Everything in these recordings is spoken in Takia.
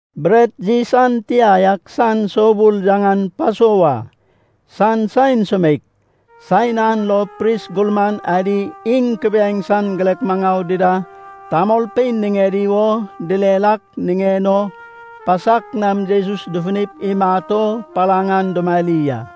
Bret yis an tia yak san soubul, yaŋan Pasova, san saen sumeik. Saen an lo pris gurman adi iŋ kubiaeŋ san girek maŋau dida tamolpein niŋedi wo direr ak niŋen o pasak nam Jesus dufunip imat o palaŋ an dumari a.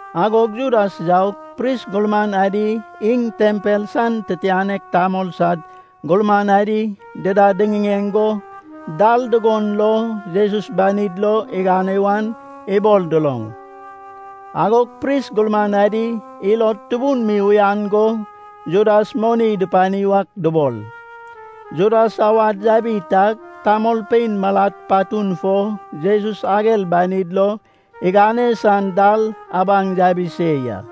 Agog Judas yaug, pris gurman adi iŋ tempel san titianek tamol sad gurman adi dida diŋiŋeŋ go dal dugon lo Jesus banid lo igane wan ibol duloŋ. Agog pris gurman adi ilod tubun mi uyan go Judas moni dupani wak dubol. Judas awad yabi tag tamolpein malad patun fo Jesus ager banid lo igane san dal abaŋ yabi se ya.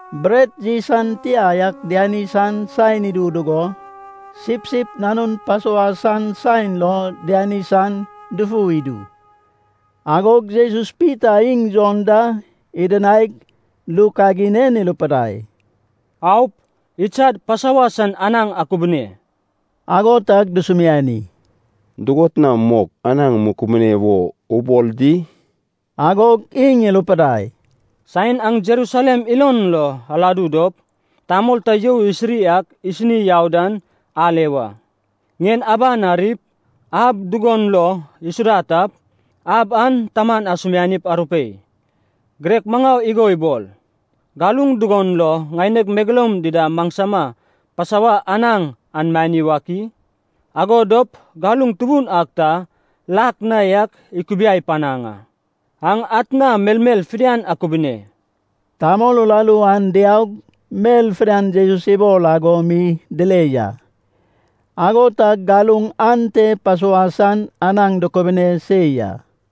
Bret yis an tia yak diani san saen idu dugo, sipsip nanun Pasova san saen lo diani san dufu idu. Agog Jesus Pita iŋ Jon da idinaig, ru kagin en irupidai, “Aup, idsad Pasova san anaŋ akubune.” Ago tag dusumiani, “Dugot na mok anaŋ mukubune wo ubol di?” Agog iŋ irupidai, “Saen aŋ Jerusalem ilon lo aladu dop, tamol ta you isiri ak isini yau dan ale wa. Ŋien aban arip, ab dugon lo isuda tap, ab an taman asumianip arupei: ‘Girek maŋau igo ibol, galuŋ dugon lo ŋaineg megeloum dida maŋsama Pasova anaŋ an mani wak i?’ Ago dop galuŋ tubun ak ta lak na yak ikubiai panaŋ a. Aŋ atna melmel fidian akubune.” Tamol uraru an diaug, mel fidian Jesus ibol ago mi dile ya. Ago tag galuŋ ante Pasova san anaŋ dukubune se ya.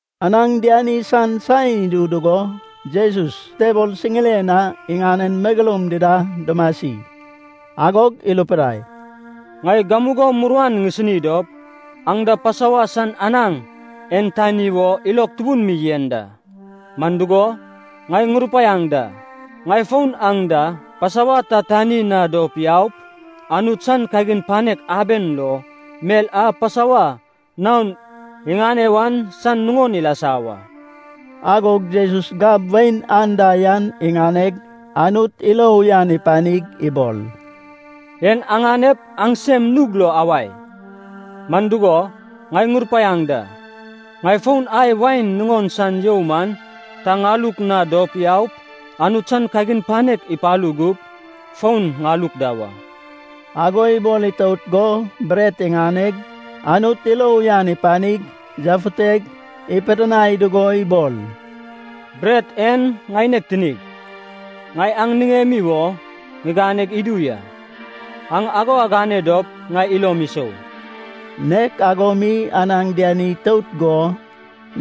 Anaŋ diani san saen idu dugo Jesus tebol siŋiren na iŋanen megeloum dida dumasi. Agog irupidai, “Ŋai gamugo muruan ŋisini dop aŋ da Pasova san anaŋ en tani wo ilog tubun mi yen da. Man dugo, ŋai ŋurupaiaŋ da, ŋai fon aŋ da Pasova ta tani na dop yaup, Anut san kagin panek aben lo, mel a Pasova naon iŋane wan san nuŋon ilasa wa.” Agog Jesus gab wain anda yan iŋaneg, Anut ilo uyan ipanig ibol, “En aŋanep aŋsem nug lo awae. Man dugo ŋai ŋurupaiaŋ da, ŋai fon ai wain nuŋon san you man ta ŋaluk na dop yaup, Anut san kagin panek ipalu gup, fon ŋaluk da wa.” Ago ibol itout go bret iŋaneg, Anut ilo uyan ipanig yafuteg, ipidinai dugo ibol, “Bret en ŋaineg tinig, ŋai aŋ niŋemi wo ŋiganeg idu ya. Aŋ ago agane dop ŋai ilom isou.” Nek ago mi anaŋ diani itout go,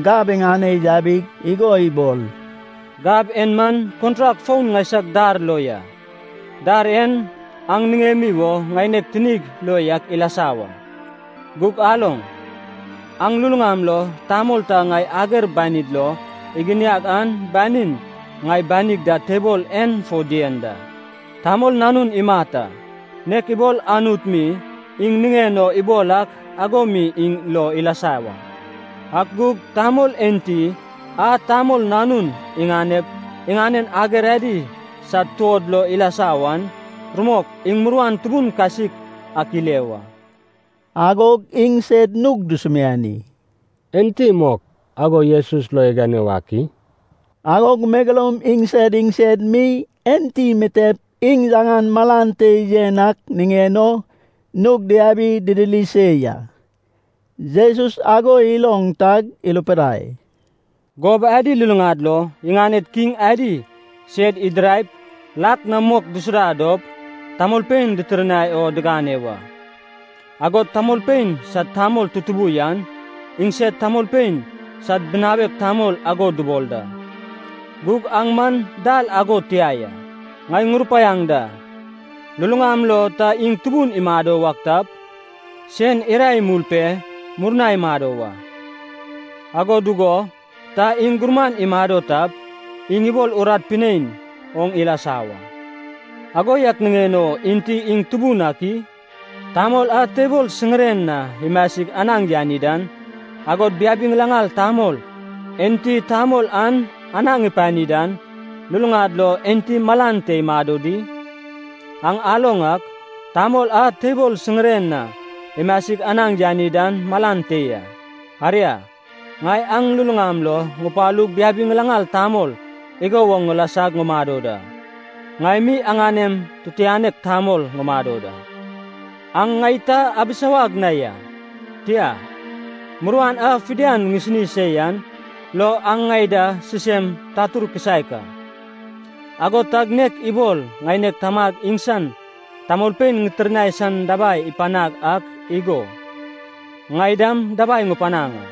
gab iŋane yabig igo ibol, “Gab en man kontrak foun ŋaisag dar lo ya. Dar en aŋ niŋemi wo ŋaineg tinig lo yak ilasa wa. Gug aloŋ. Aŋ luluŋam lo tamol ta ŋai ager banid lo iginiag an banin, ŋai banig da tebol en fo dien da. Tamol Nanun imat a, nek ibol Anut mi iŋ niŋen o ibol ak ago mi iŋ lo ilasa wa. Ak gug tamol enti a Tamol Nanun iganep iŋanen ager adi sad tuod lo ilasa wan, rumok iŋ muruan tubun kasik ak ile wa!” Agog iŋsed nug dusumiani, “Enti mok ago Jesus lo igane wak i?” Agog megeloum iŋsed iŋsed mi enti mitep iŋ yaŋan malan te yen ak niŋen o nug diabi didiri se ya. Jesus ago iloŋ tag irupidai, “Gob adi luluŋad lo iŋaned kiŋ adi sed idiraip lak na mok disuda dop tamolpein ditirnai o digane wa. Agod tamolpein sad tamol tutubu yan, iŋsed tamolpein sad binawek tamol ago dubol da. Gug aŋ man dal ago tia ya. Ŋai ŋurupaiaŋ da, luluŋam lo ta iŋ tubun imado wak tap, sen irae imul pe murna imado wa. Ago dugo ta iŋ gurman imado tap, iŋ ibol urat pinein oŋ ilasa wa. Ago yak niŋen o enti iŋ tubun ak i? Tamol a tebol siŋiren na imasig anaŋ yani dan, agod biabi ŋilaŋal tamol enti tamol an anaŋ ipani dan, luluŋad lo enti malan te imado di? Aŋ aloŋ ak, tamol a tebol siŋiren na imasig anaŋ yani dan malan te ya. Aria, ŋai aŋ luluŋam lo ŋupalug biabi ŋilaŋal tamol igo woŋ ŋilasag ŋumado da. Ŋai mi aŋanem tutuŋanek tamol ŋumado da. Aŋ ŋai ta abisawag na ya, tia, muruan a fidian ŋisini se yan lo aŋ ŋai da sisem tatur kisaek a. Ago tag nek ibol ŋaineg Tamag iŋsan tamolpein ŋitirnai san dabai ipanag ak igo, ŋai dam dabai ŋupanaŋ a,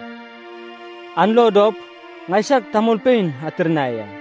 an lo dop ŋaisag tamolpein atirnai a.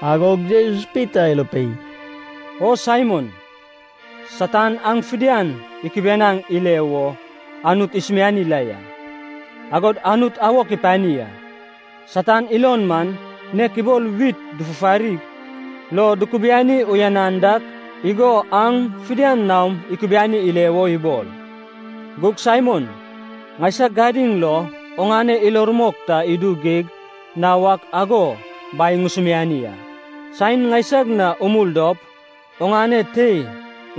Agog Jesus Pita irupei, “O Saimon, Satan aŋ fidian ikibianaŋ ile wo Anut isumiani la ya, agod Anut awok ipani a. Satan ilon man nek ibol wit dufufarig lo dukubiani uyanan dak igo aŋ fidian naom ikubiani ile wo ibol. Gug Saimon, ŋaisag gadiŋ lo oŋane ilo rumok ta idu geig na wak ago Bai ŋusumiani a. Saen ŋaisag na umul dop, oŋane tei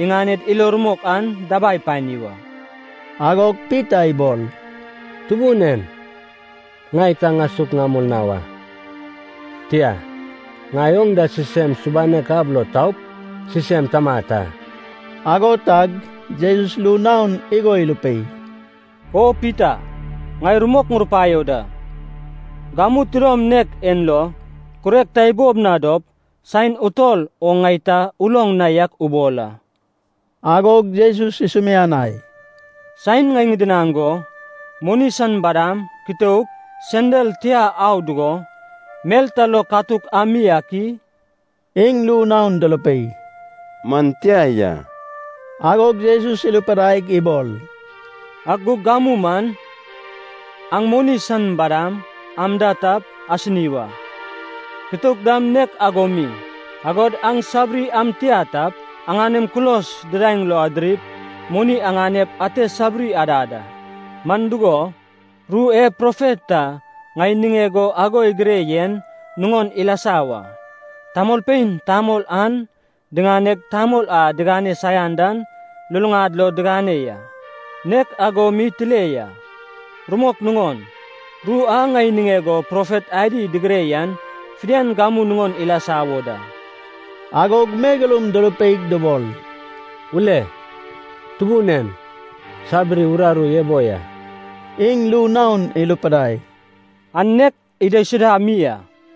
iŋaned ilo rumok an dabai pani wa.” Agog Pita ibol, “Tubun en, ŋai ta ŋasuk ŋamul na wa, tia, ŋai oŋ da sisem subanek ab lo taup, sisem tamat a.” Ago tag Jesus ru naon igo irupei, “O Pita, ŋai rumok ŋurupaio da, gamu tidom nek en lo kurek ta ibob na dop, saen utol oŋ ŋai ta uloŋ na yak ubol a.” Agog Jesus isumianai, “Saen ŋai ŋidinaŋ go, moni san badam, kitouk, sendal tia au dugo, mel ta lo katuk ami ak i?” Iŋ ru naon durupei, “Man tia ya.” Agog Jesus irupidaig ibol, “Ak gug gamu man, aŋ moni san badam am da tap, asini wa. Kitouk dam nek ago mi. Agod aŋ sabiri am tia tap, aŋanem kulos didaeŋ lo adirip moni aŋanep ate sabiri adad a. Man dugo, ru e profet ta ŋai niŋeg o ago igire yen nuŋon ilasa wa, ‘Tamolpein tamol an diŋaneg tamol a digane saian dan luluŋad lo digane ya. Nek ago mi tile ya.’ Rumok nuŋon, ru a ŋai niŋeg o profet adi digire yan fidian gamu nuŋon ilasa wo da.” Agog megeloum durupeig dubol, “Ule, Tubun en, sabiri uraru ebo ya.” Iŋ ru naon irupidai, “An nek idaisuda mi a.”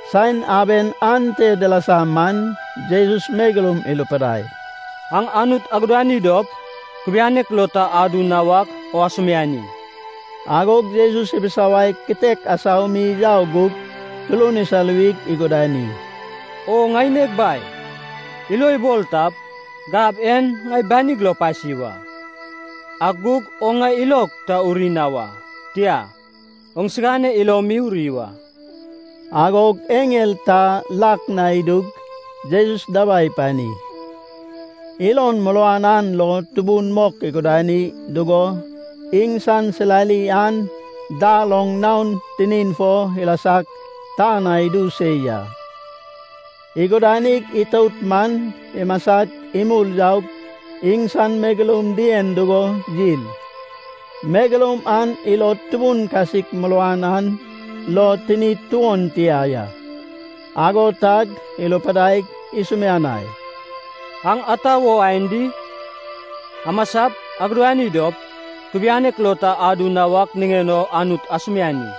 Saen aben ante dilasa man, Jesus megeloum irupidai, “Aŋ Anut agudani dop, kubianek lo ta adu na wak o asumiani.” Agog Jesus ibisawaig kitek asau mi yau gug turun isaluwig igudani, “O ŋaineg Bai, ilo ibol tap, gab en ŋai banig lo pasi wa. Ak gug oŋ ŋai ilog ta uri na wa, tia, oŋsigane ilo mi uri wa.” Agog eŋel ta lak na idug Jesus dabai ipani. Ilon muruan an lo tubun mok igudani dugo iŋsan silali an dar oŋ naon tinin fo ilasag tan na idu se ya. Igudanig itout man imasag, imul yaug iŋsan megeloum dien dugo yil. Megeloum an ilod tubun kasik muruan an lo tinid tuon tia ya. Ago tag irupidaig isumianai, “Aŋ ata wo aen di? Amasap, agudani dop, kubianek lo ta adu na wak niŋen o Anut asumiani.”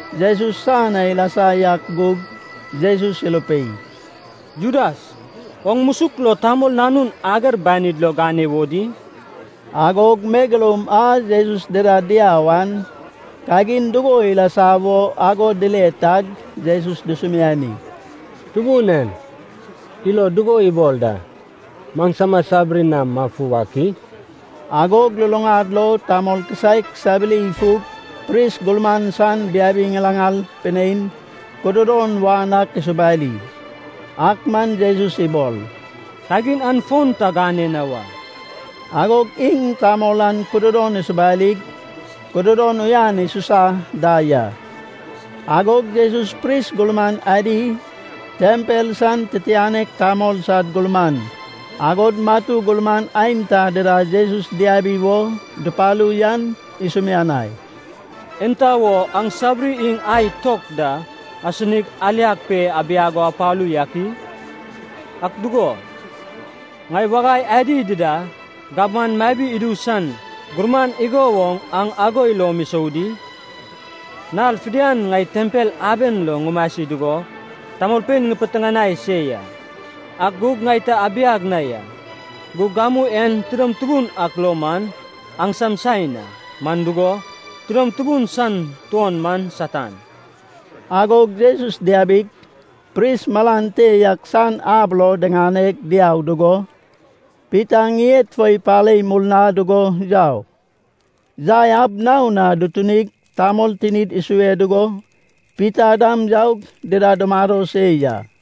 Jesus san na ilasa yak gug Jesus irupei, “Judas, oŋ musuk lo Tamol Nanun ager banid lo gane wo di?” Agog megeloum a Jesus dida diau an, kagin dugo ilasa wo ago dile tag Jesus dusumiani, “Tubun en, ilo dugo ibol da, maŋsama sabiri nam mafu wak i?” Agog luluŋad lo tamol kisaek sabiri ifug pris gurman san biabi ŋilaŋal pinein kududon won ak isubari. Ak man Jesus ibol, “Kagin an fon ta gane na wa.” Agog iŋ tamol an kududon isupurig, kududon uyan isusa da ya. Agog Jesus pris gurman adi, tempel san titianek tamol sad gurman, agod matu gurman aenta dida Jesus diabi wo dupalu yan isumianai, “Enta wo aŋ sabiri iŋ ai tok da asinig aliag pe abiag o apalu yak i? Ak dugo, ŋai wagai adi dida gabman mabi idu san gurman igo woŋ aŋ ago ilom isou di? Nal fidian ŋai tempel aben lo ŋumasi dugo tamolpein ŋipiteŋanai se ya, ak gug ŋai ta abiag na ya. Gug gamu en tidom tubun ak lo man aŋsam saen a, man dugo, tidom tubun san tuon man Satan.” Agog Jesus diabig, pris malan te yak san ab lo diŋane diau dugo Pita ŋied fo ipare murna dugo yau. Yai ab naon na dutunig, tamol tinid isue dugo Pita dam yaug dida dumado se ya.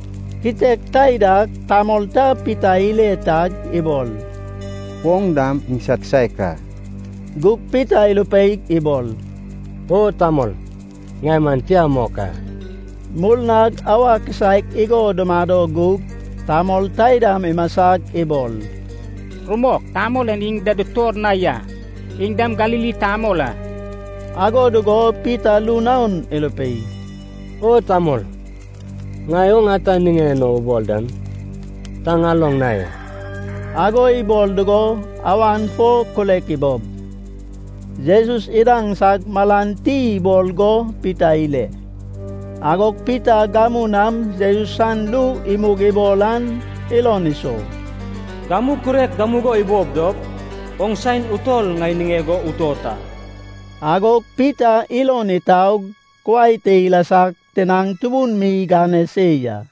Kitek taidag tamol ta Pita ile tag ibol, “Oŋ dam iŋsad kisaek a.” Gug Pita irupeig ibol, “O tamol, ŋai man tia mok a!” Murnag auwa kisaek igo dumado gug tamol taidam imasag ibol, “Rumok, tamol en iŋ da dutor na ya. Iŋ dam Galili tamol a.” Ago dugo Pita ru naon irupei, “O tamol, ŋai oŋ ata niŋen o ubol dan ta ŋaloŋ na ya!” Ago ibol dugo awan fo kurek ibob. Jesus idaŋsag, malan ti ibol go Pita ile. Agog Pita gamu nam Jesus san ru imug ibol an ilon isou, “Gamu kurek gamugo ibob dop, oŋ saen utol ŋai niŋeg o utot a.” Agog Pita ilon itaug, kuai te ilasag tinaŋ tubun mi igane se ya.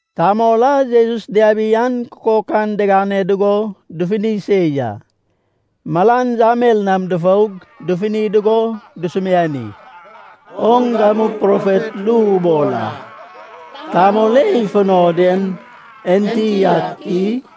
Tamol a Jesus diabi an kukok an digane dugo dufuni se ya. Malan yamel nam dufoug, dufuni dugo dusumiani, “Oŋ gamu profet ru ubol a, tamol e ifuno den enti ak i?”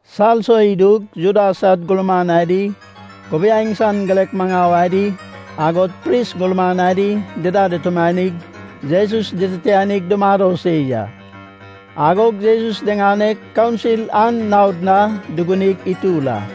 Salso idug Juda sad gurman adi, kubiaeŋ san girek maŋau adi, agod pris gurman adi dida dutumanig Jesus dititianig dumado se ya. Agog Jesus diŋaneg kaunsil an naod na dugunig itur a.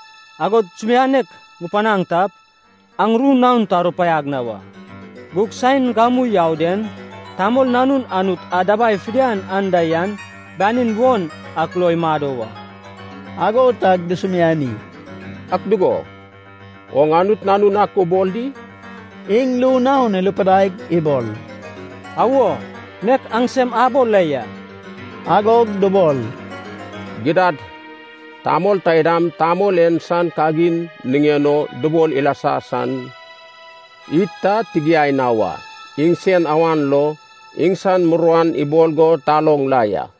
Agod sumianek ŋupanaŋ tap, aŋ ru naon ta arupaiag na wa. Gug saen gamu yau den, Tamol Nanun Anut a dabai fidian anda yan banin won ak lo imado wa.” Ago tag dusumiani, “Ak dugo, oŋ Anut nanun ak ubol di?” Iŋ ru naon irupidaig ibol, “Awo, nek aŋsem abol la ya.” Agog dubol, “Gidad, tamol taidam, tamol en san kagin niŋen o dubol ilasa san id ta tigiai na wa. Iŋsen awan lo iŋsan muruan ibol go taloŋ la ya.”